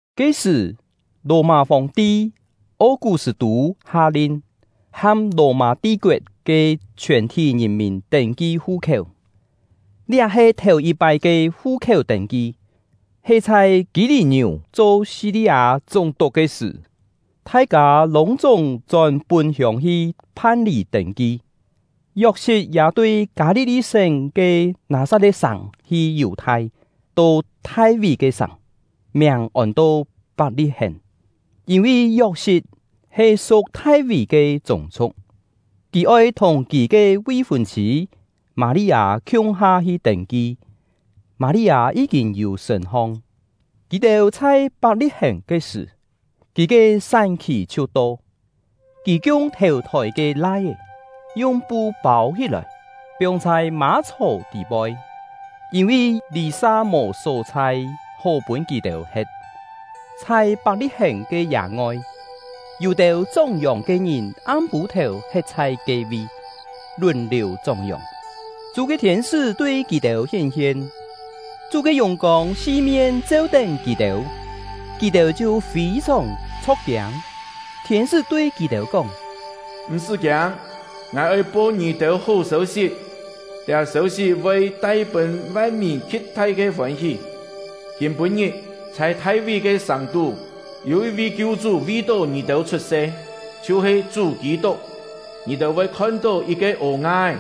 Ke-sṳ̀, Lò-mâ Fòng-ti O-kú-sṳ̂-tû ha-lin, ham Lò-mâ ti-koet ke chhiòn-thí ngìn-mìn tên-ki fu-khiéu. Liá he thèu-yit-pái ke fu-khiéu tên-ki, he chhai Kî-lî-ngiú cho Si-li-â chúng-tuk ke sṳ̀. Thai-kâ lûng-chúng chón pún-hiông hi phan-lî tên-ki. Yok-sit ya tui Kâ-li-li-sén ke Nâ-sat-le̍t-sàng hi Yù-thai, to Thai-ví ke sàng, miàng ôn-to Pak-li-hèn; yîn-vi Yok-sit he su̍k Thai-ví ke chûng-chhu̍k. Kì oi thùng kì ke vi-fûn-chhî Mâ-li-â khiung-ha hi tên-ki. Mâ-li-â yí-kîn yû sṳ̂n-hong; kì-têu chhai Pak-li-hèn ke sṳ̀, kì ke sán-khì chhiu to. Kì kiung thèu-thôi ke lai-é, yung pu pâu-hí-lòi, piong chhai mâ-chhò tî-poi, yîn-vi lî-sa mò só-chhai hó pûn kì-têu he̍t. Chhai Pak-li-hèn ke yâ-ngoi, yû-têu chóng-yòng ke ngìn am-pû-thèu he̍t chhai ke-vi, lùn-liù chóng-yòng. Chú ke thiên-sṳ́ tui kì-têu hién-hien, Chú ke yùng-kông si-mien cheu-tén kì-têu, kì-têu chhiu fî-sòng chho̍k-kiâng. Thiên-sṳ́ tui kì-têu kóng: “M̀-sṳ́ kiâng! Ngài oi po ngì-têu hó sêu-sit; liá sêu-sit voi tai pûn van-mìn khi̍t-thai ke fôn-hí. Kîm-pû-ngit, chhai Thai-ví ke sàng-tú, yû yit-vi Kiu-chú vi-tó ngì-têu chhut-se, chhiu-he Chú Kî-tuk. Ngì-têu voi khon-tó yit-ke ô-nga-é,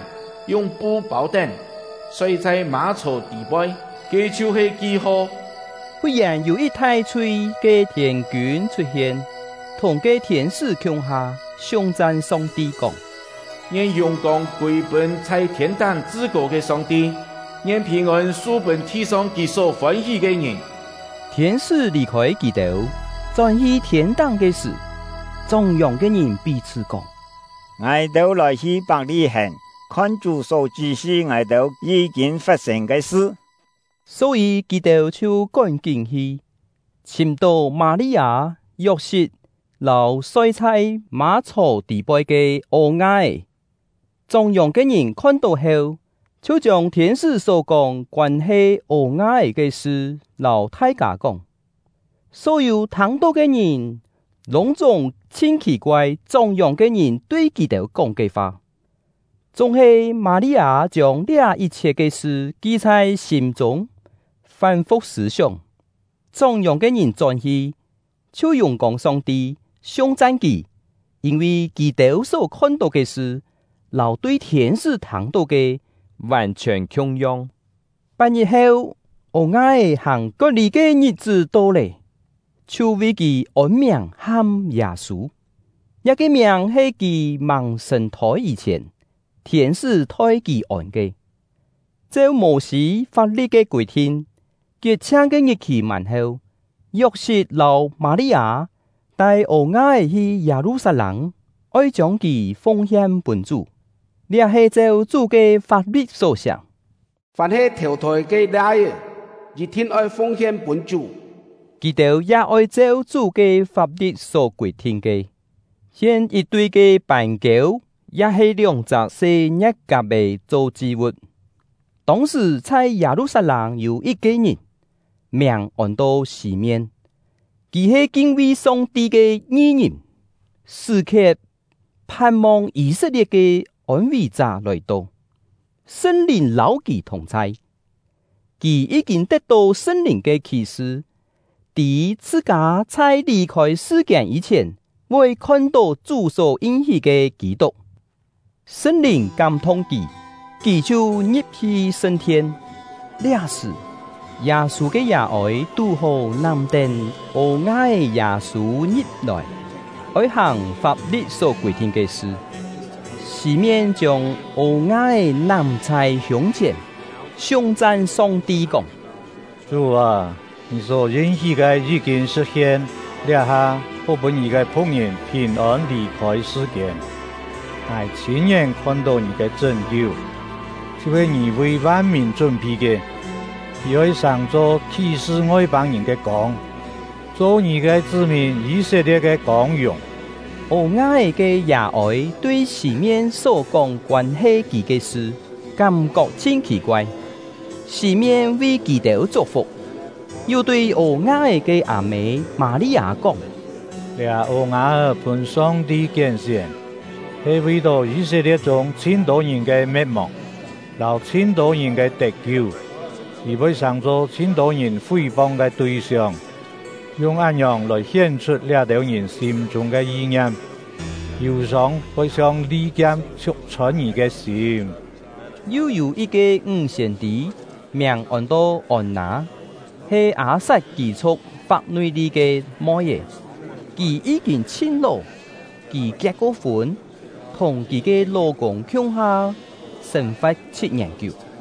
yung pu pâu-tén, soi chhai mâ-chhò tî-poi; ke chhiu-he ki-ho.” Fut-yèn, yû yit thai-chhui ke thiên-kiûn chhut-hien, thùng ke thiên-sṳ́ khiung-ha, siung-chan Song-ti kóng: Ngien yùng-kông kûi-pûn chhai thiên-táng Chṳ-kô ke Song-ti; ngien phìn-ôn su-pûn thi-song Kì só fôn-hí ke ngìn. Thiên-sṳ́ lì-khôi kì-têu, chón-hi thiên-táng ke sṳ̀, chóng-yòng ke ngìn pí-chhṳ́ kóng: “Ngài-têu lòi-hi Pak-li-hèn, khon Chú só chṳ́-sṳ ngài-têu yí-kîn fat-sên ke sṳ.” Só-yî, kì-têu chhiu kón-kín hi, chhìm-tó Mâ-li-â, Yok-sit, lâu soi chhai mâ-chhò tî-poi ke ô-nga-é. Chóng-yòng ke ngìn khon-tó heu, chhiu chiông thiên-sṳ́ só-kóng koân-he ô-nga-é ke sṳ lâu thai-kâ kóng. Só-yû thâng-tó ke ngìn lûng-chúng chhin khì-koai chóng-yòng ke ngìn tui kì-têu kóng ke fa. Chúng-he Mâ-li-â chiông liá yit-chhiet ke sṳ ki chhai sîm-chûng, fán-fu̍k sṳ̂-sióng. Chóng-yòng ke ngìn chón-hi, chhiu yùng-kông Song-ti, siung-chan Kì, yîn-vi kì-têu só khon-tó ke sṳ, lâu tui thiên-sṳ́ thâng-tó ke vàn-chhiòn khiung-yong. Pat-ngit heu, ô-nga-é hàng kot-lî ke ngit-è to lé, chhiu vi kì ôn-miàng ham Yâ-sû; liá-ke miàng he kì màng sàng-thôi yî-chhièn thiên-sṳ́ thoi kì ôn ke. Cheu Mô-sî fap-li̍t ke kûi-thin, kiet-chhiang ke ngit-khì mân heu, Yok-sit lâu Mâ-li-â tai ô-nga-é hi Yâ-lu-sat-lâng, oi chiông kì fung-hien pûn Chú. (Liá he cheu Chú ke fap-li̍t só siá: “Fàm he thèu-thôi ke lai-é, yit-thin oi fung-hien pûn Chú.”) Kì-têu ya oi cheu Chú ke fap-li̍t só kûi-thin ke, hien yit-tui ke pân-kiêu ya-he lióng-chak se ngie̍t-kap-è cho chi-vu̍t. Tông-sṳ̀, chhai Yâ-lu-sat-lâng yû yit-ke ngìn, miàng ôn-to Sî-mien. Kì he kin-vi Song-ti ke ngi-ngìn, sṳ̀-khiet phan-mong Yî-set-lie̍t ke ôn-ví-chá lòi-to. Sṳn-Lìn lâu kì thùng-chhai; kì yí-kîn tet-tó Sṳn-Lìn ke khí-sṳ, tî chhṳ-kâ chhai lì-khôi sṳ-kiên yî-chhièn voi khon-tó Chú só yin-hí ke Kî-tuk. Sṳn-Lìn kám-thung kì, kì chhiu ngi̍p-hi sṳn-thien. Liá-sṳ̀, Yâ-sû ke yà-ôi tú-hó nám-tén ô-nga-é Yâ-sû ngi̍p-lòi, oi hàng fap-li̍t só kûi-thin ke sṳ. Sî-mien chiông ô-nga-é nám chhai hiûng-chhièn, siung-chan Song-ti kóng: Chú â, Ngì só yin-hí ke yí-kîn sṳ̍t-hien; liá-ha, hó pûn Ngì ke phu̍k-ngìn phìn-ôn lì-khôi sṳ-kiên. Ngài chhîn-ngién khon-tó Ngì ke chṳ́n-kiu, chhiu-he Ngì vi van-mìn chún-phi ke: Kì oi sàng-cho khí-sṳ Ngoi-pâng-ngìn ke kông, cho Ngì ke chṳ́-mìn Yî-set-lie̍t ke kông-yùng. Ô-nga-é ke yà-ôi tui Sî-mien só kóng koân-he kì ke sṳ kám-kok chhin khì-koai. Sî-mien vi kì-têu chuk-fuk, yu tui ô-nga-é ke â-mê Mâ-li-â kóng: “Liá ô-nga-é pûn Song-ti kién-sién, he vi-tó Yî-set-lie̍t chûng chhin-tô ngìn ke me̍t-mòng, lâu chhin-tô ngìn ke tet-kiu. Kì voi sàng-cho chhin-tô ngìn fí-pong ke tui-siong, yung án-ngiòng lòi hién-chhut liá-têu ngìn sîm-chûng ke yi-ngiam. Yù-sông voi chhiong li-kiam chhiuk-chhôn ngì ke sîm.” Yu yû yit-ke ńg siên-tî, miàng ôn-to Ôn-nâ, he Â-sat kî-chhu̍k Fap-nui-li̍t ke moi-é. Kì yí-kîn chhin ló. Kì kiet-ko-fûn, thùng kì ke ló-kûng khiung-ha sên-fa̍t chhit-ngièn kiú,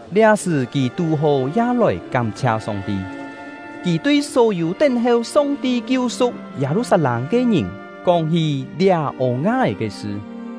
Liá-sṳ̀, kì tú-hó ya lòi kám-chhia Song-ti. Kì tui só-yû tén-heu Song-ti kiu-su̍k Yâ-lu-sat-lâng ke ngìn kóng-hí liá ô-nga-é ke sṳ.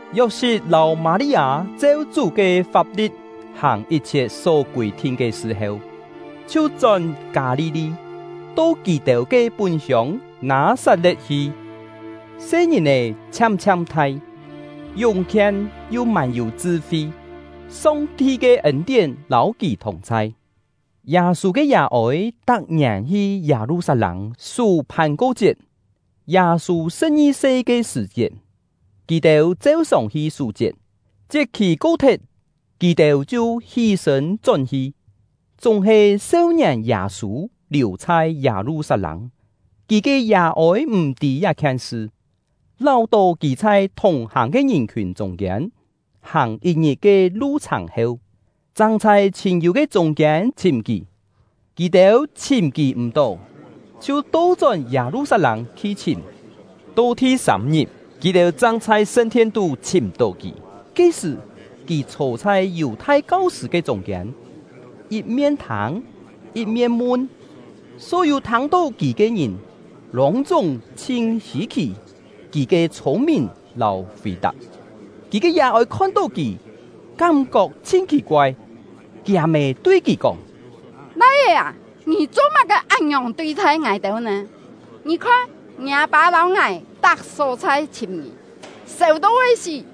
Yok-sit lâu Mâ-li-â cheu Chú ke fap-li̍t hàng yit-chhiet só kûi-thin ke sṳ heu, chhiu chón Kâ-li-li, to kì-têu ke pún-hiông Nâ-sat-le̍t hi. Se-ngìn-è chhiam-chhiam thai, yúng-khien yu mân-yû chṳ-fi; Song-ti ke ên-tién lâu kì thùng-chhai. Yâ-sû ke yà-ôi tak-ngièn hi Yâ-lu-sat-lâng sú Phàn-ko-chiet. Yâ-sû sṳ̍p-ngi-se ke sṳ̀-chiet, kì-têu cheu-sòng hi sú-chiet. Chiet-khì ko-thet, kì-têu chhiu hí-sṳ̂n chón-hi, chúng-he seu-ngièn Yâ-sû liù chhai Yâ-lu-sat-lâng; kì ke yà-ôi m̀ tî liá-khien sṳ, láu-tó kì chhai thùng-hàng ke ngìn-khiùn chûng-kiên; hàng yit-ngit ke lu-chhàng heu, chang chhai chhîn-yû ke chûng-kiên chhìm kì. Kì-têu chhìm kì m̀-tó, chhiu to-chón Yâ-lu-sat-lâng hi chhìm. To thi-sâm-ngit, kì-têu chang chhai sṳn-thien-tú chhìm-tó kì. Ke-sṳ̀ kì chhô chhai Yù-thai kau-sṳ̂ ke chûng-kiên, yit-mien thâng, yit-mien mun; só-yû thâng-tó kì ke ngìn lûng-chúng chhin hî-khì kì ke chhûng-mìn lâu fì-tap. Kì ke yà-ôi khon-tó kì, kám-kok chhin khì-koai. Kiâ-mê tui kì kóng: “Lai-é â, ngì cho-má-ke án-ngiòng tui-thai ngài-têu nè? Ngì khon, ngiâ pâ lâu ngài tak só-chhai chhìm ngì, sèu to voi sí!”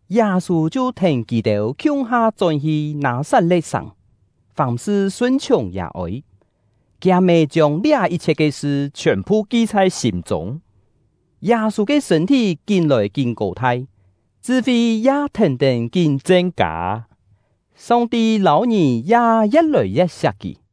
Yâ-sû chhiu thèn kì-têu khiung-ha chón-hi Nâ-sat-le̍t-sàng, fàm-sṳ sun-chhiùng yà-ôi. Kiâ-mê chiông liá yit-chhiet ke sṳ chhiòn-phu ki chhai sîm-chûng. Yâ-sû ke sṳ̂n-thí kín-lòi kín kô-thai, chṳ-fi ya thèn-tén kín chen-kâ, Song-ti lâu ngìn ya ye̍t lòi ye̍t siak kì.